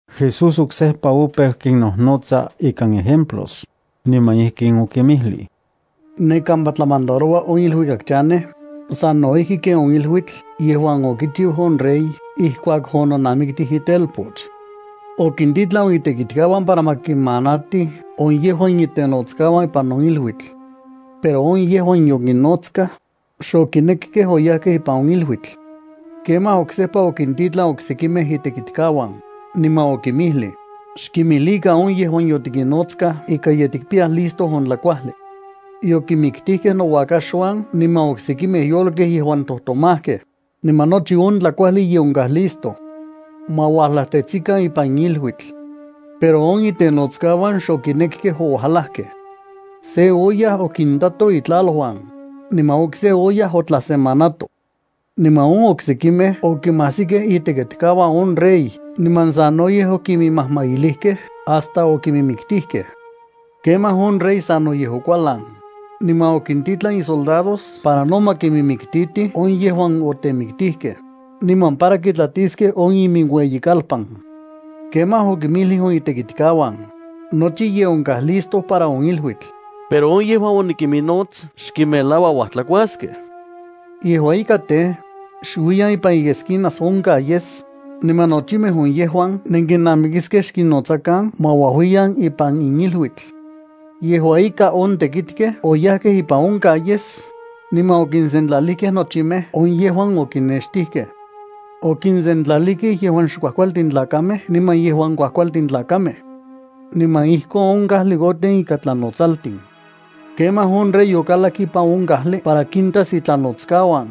Jesús oksejpa opeu kinnojnotsa ikan ejemplos, niman ijkin okinmijlij: —Ne kampa tlamandaroua on iluikak chanej sano ijki ken on iluitl yejuan okichiu on rey ijkuak ononamiktij itelpoch. Okintitlan on itekitkauan para ma kimanatij on yejuan itenotskauan ipan on iluitl. Pero on yejuan yokinnotskaj, xokinekkej oyajkej ipan on iluitl. Kemaj oksejpa okintitlan oksekimej itekitkauan, niman okinmijlij: “Xkimijlikan on yejuan yotikinnotskaj ika ye listo on tlakuajli. Yokinmiktijkej nouakaxuan niman oksekimej yolkej yejuan tojtomajkej, niman nochi on tlakuajli ye onkaj listo. Ma ualajtetsikan ipan in iluitl.” Pero on itenotskauan xokinekkej ouajlakkej. Se oyaj okintato itlaluan, niman okse oyaj otlasemanato. Niman on oksekimej okimajsikej itekitkauan on rey niman sanoyej okiminmajmailijkej hasta okiminmiktijkej. Kemaj, on rey sanoyej okualan, niman okintitlan isoldados para no ma kiminmiktitij on yejuan otemiktijkej, niman para kitlatiskej on iminueyikalpan. Kemaj okinmijlij on itekitkauan: “Nochi ye onkaj listo para on iluitl, pero on yejuan onikiminnots xkinmelaua uajtlakuaskej. Yejua ika tej, xuiyan ipan iesquinas on calles, niman nochimej on yejuan nenkinnamikiskej xkinnotsakan ma uajuiyan ipan in iluitl.” Yejua ika on tekitkej oyajkej ipan on calles, niman okinsentlalijkej nochimej on yejuan okinnextijkej. Okisentlalijkej yejuan xkuajkualtin tlakamej niman yejuan kuajkualtin tlakamej. Niman ijkon on kajli oten ikan tlanotsaltin. ’Kemaj on rey okalak ipan on kajli para kintas itlanotskauan.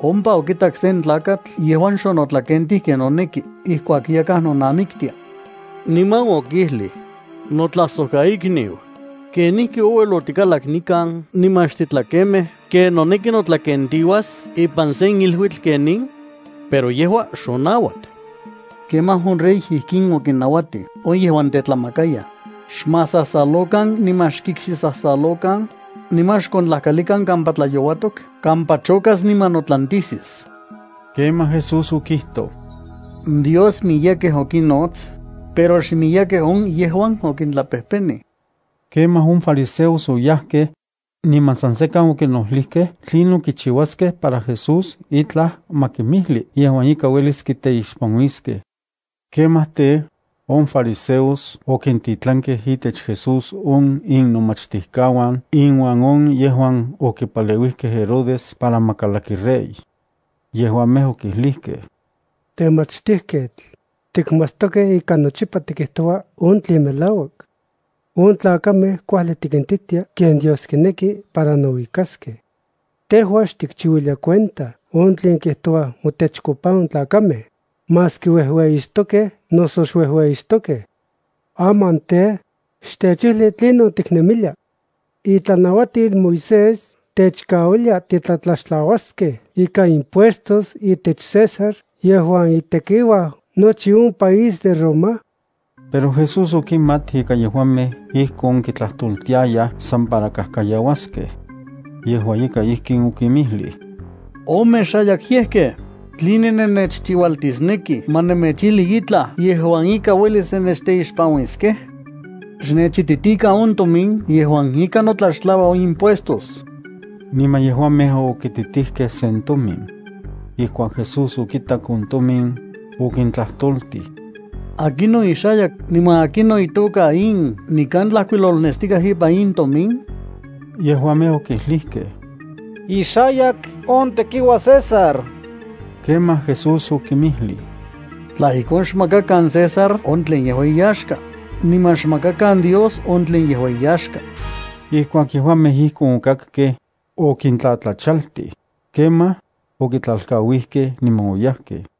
Ompa okitak sen tlakatl yejuan xonotlakentij ken noneki ijkuak yakaj nonamiktia. Niman okijlij: “Notlajsojkaikniu, ¿kenijki ouel otikalak nikan niman xtitlakemej ken noneki notlakentiuas ipan sen iluitl ken in?” Pero yejua xonauat. Kemaj on rey ijkin okinnauatij on yejuan tetlamakayaj: “Xmasasalokan niman xkikxisasalokan, niman xkontlajkalikan kampa tlayouatok kampa chokas niman notlantisis.” Kemaj Jesús okijtoj: —Dios miyekej okinnots, pero xmiyekej on yejuan okintlapejpenij. Kemaj on fariseos oyajkej, niman san sekan okinojlijkej tlinon kichiuaskej para Jesús itlaj ma kimijli yejuan ika uelis kiteixpanuiskej. Kemaj tej, on fariseos okintitlankej itech Jesús on innomachtijkauan inuan on yejuan okipaleuijkej Herodes para ma kalaki rey. Yejuamej okijlijkej: —Temachtijketl, tikmatstokej ika nochipa tikijtoua on tlen melauak. On tlakamej kuajli tikintitia ken Dios kineki para nouikaskej. Tejua xtikchiuilia cuenta on tlen kijtouaj motechkopa on tlakamej, maski uejueyixtokej noso xuejueyixtokej. Aman tej, xtechijli tlinon tiknemilia. ¿Itlanauatil Moisés techkauilia titlatlaxtlauaskej ikan impuestos itech César yejuan itekiuaj nochi on país de Roma? Pero Jesús okimat ika yejuamej ijkon kitlajtoltiayaj san para kajkayauaskej. Yejua ika ijkin okinmijlij: —Omexayakyejkej, ¿tline nennechchiualtisnekij ma nemechijli itlaj yejuan ika uelis nennechteixpanuiskej? Xnechititikan on tomin yejuan ika notlaxtlaua on impuestos. Niman yejuamej okititijkej sen tomin. Ijkuak Jesús okitak on tomin, okintlajtoltij: —¿Akinon ixayak, niman akinon itoka in nikan tlajkuilolnestikaj ipan in tomin? Yejuamej okijlijkej: —Ixayak on tekiuaj César. Kemaj Jesús okinmijlij: —Tla ijkon xmakakan César on tlen yejua iyaxka, niman xmakakan Dios on tlen yejua iyaxka. Ijkuak yejuamej ijkon okakkej, okintlatlachaltij. Kemaj, okitlalkauijkej niman oyajkej.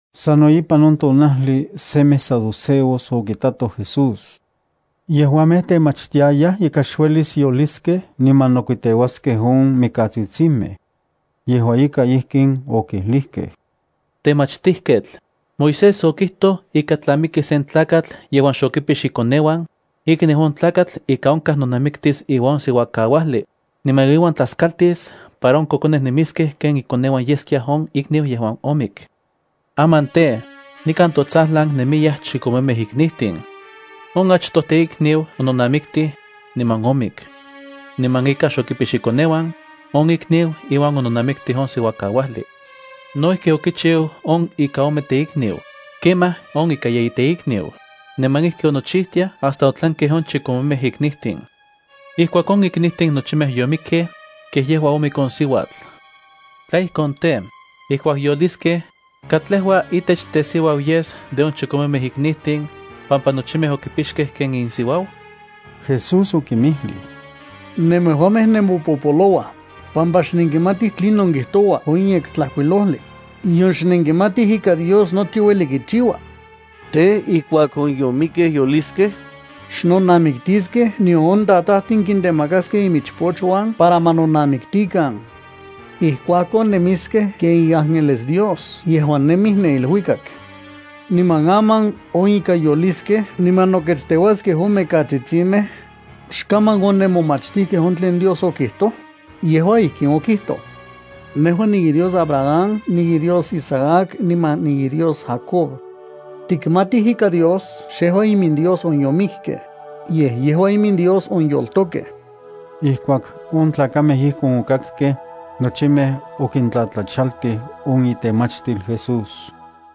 Sano ipan on tonajli semej saduceos okitatoj Jesús. Yejuamej temachtiayaj ika xuelis yoliskej niman nokuiteuaskej on mikatsitsimej. Yejua ika ijkin okijlijkej: —Temachtijketl, Moisés okijtoj ika tla miki sen tlakatl yejuan xokipix ikoneuan, ikniu on tlakatl ika onkaj nonamiktis iuan on siuakauajli, niman iuan tlaskaltis para on kokonej nemiskej ken ikoneuan yeskia on ikniu yejuan omik. Aman tej, nikan totsajlan nemiyaj chikomemej iknijtin. On achtoj teikniu ononamiktij, niman omik. Niman ika xokipix ikoneuan, on ikniu iuan ononamiktij on siuakauajli. No ijki okichiu on ika ome teikniu, kemaj on ika yeyi teikniu, niman ijki onochijtiaj hasta otlankej on chikomemej iknijtin. Ijkuak on iknijtin nochimej yomikkej, kej yejua omik on siuatl. Tla ijkon tej, ijkuak yoliskej, ¿katlejua itech tesiuau yes de on chikomemej iknijtin, pampa nochimej okipixkej ken insiuau? Jesús okinmijlij: —Nemejuamej nemopopolouaj, pampa xnenkimatij tlinon kijtoua on Yektlajkuilojli, nion xnenkimatij ika Dios nochi ueli kichiua. Tej, ijkuak on yomikkej yoliskej, xnonamiktiskej nion on tatajtin kitemakaskej imichpochuan para ma nonamiktikan. Ijkuakon nemiskej ken iángeles Dios yejuan nemij ne iluikak. ’Niman aman on ika yoliskej niman noketsteuaskej on mikatsitsimej, ¿xaman onenmomachtijkej on tlen Dios okijtoj? Yejua ijkin okijtoj: “Nejua niiDios Abraham, niiDios Isaac niman niiDios Jacob.” Tikmatij ika Dios xejua iminDios on yomikkej, yej yejua iminDios on yoltokej. Ijkuak on tlakamej ijkon okakkej, nochimej okintlatlachaltij on itemachtil Jesús.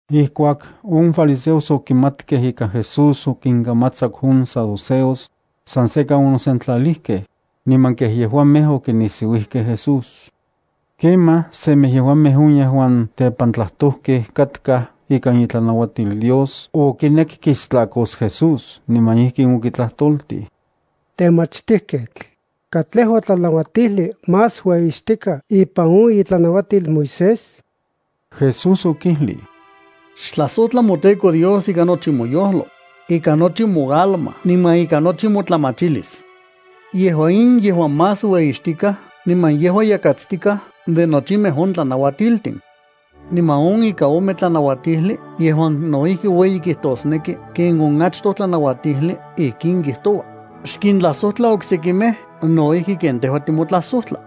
Ijkuak on fariseos okimatkej ika Jesús okinkamatsaku on saduceos, san sekan onosentlalijkej, niman kej yejuamej okinisiuijkej Jesús. Kemaj semej yejuamej on yejuan tepantlajtojkej katkaj ikan itlanauatil Dios okinek kistlakos Jesús, niman ijkin okitlajtoltij: —Temachtijketl, ¿katlejua tlanauatijli más ueyixtikaj ipan on itlanauatil Moisés? Jesús okijlij: —“Xtlajsojtla moTEKO Dios ikan nochi moyojlo, ikan nochi moalma niman ikan nochi motlamachilis.” Yejua in yejua más ueyixtikaj niman yejua yakatstikaj de nochimej on tlanauatiltin. Niman on ika ome tlanauatijli yejuan no ijki ueyi kijtosneki ken on achtoj tlanauatijli ijkin kijtoua: “Xkintlajsojtla oksekimej no ijki ken tejua timotlajsojtla.”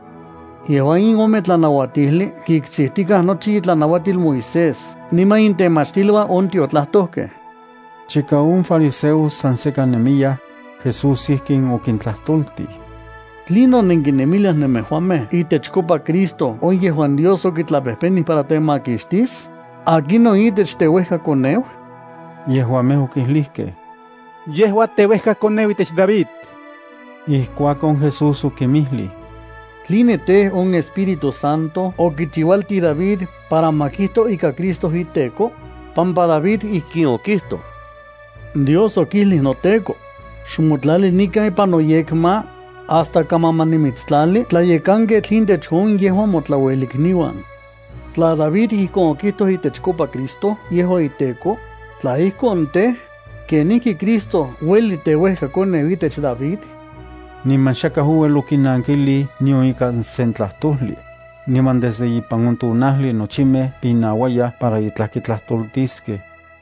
Yejua in ome tlanauatijli kiktsijtikaj nochi itlanauatil Moisés niman intemachtiluan on tiotlajtojkej. Chika on fariseos san sekan nemiyaj, Jesús ijkin okintlajtoltij: —¿Tlinon nenkinemiliaj nemejuamej itechkopa Cristo on yejuan Dios okitlapejpenij para temakixtis? ¿Akinon itech teuejkakoneu? Yejuamej okijlijkej: —Yejua teuejkakoneu itech David. Ijkuakon, Jesús okinmijlij: —¿Tline tej, on Espíritu Santo okichiualtij David para ma kijto ika Cristo “iTEKO”? David ijkin okijtoj: Dios okijlij noTEKO: “Xmotlali nikan ipan noyekma, hasta kaman ma nimitstlali tlayekanketl intech on yejuan motlauelikniuan.” Tla David ijkon okijtoj itechkopa Cristo yejua iTEKO, tla ijkon tej, ¿kenijki Cristo ueli teuejkakoneu itech David? Niman xakaj ouel okinankilij nion ikan se tlajtojli. Niman desde ipan on tonajli nochimej pinauayaj para itlaj kitlajtoltiskej.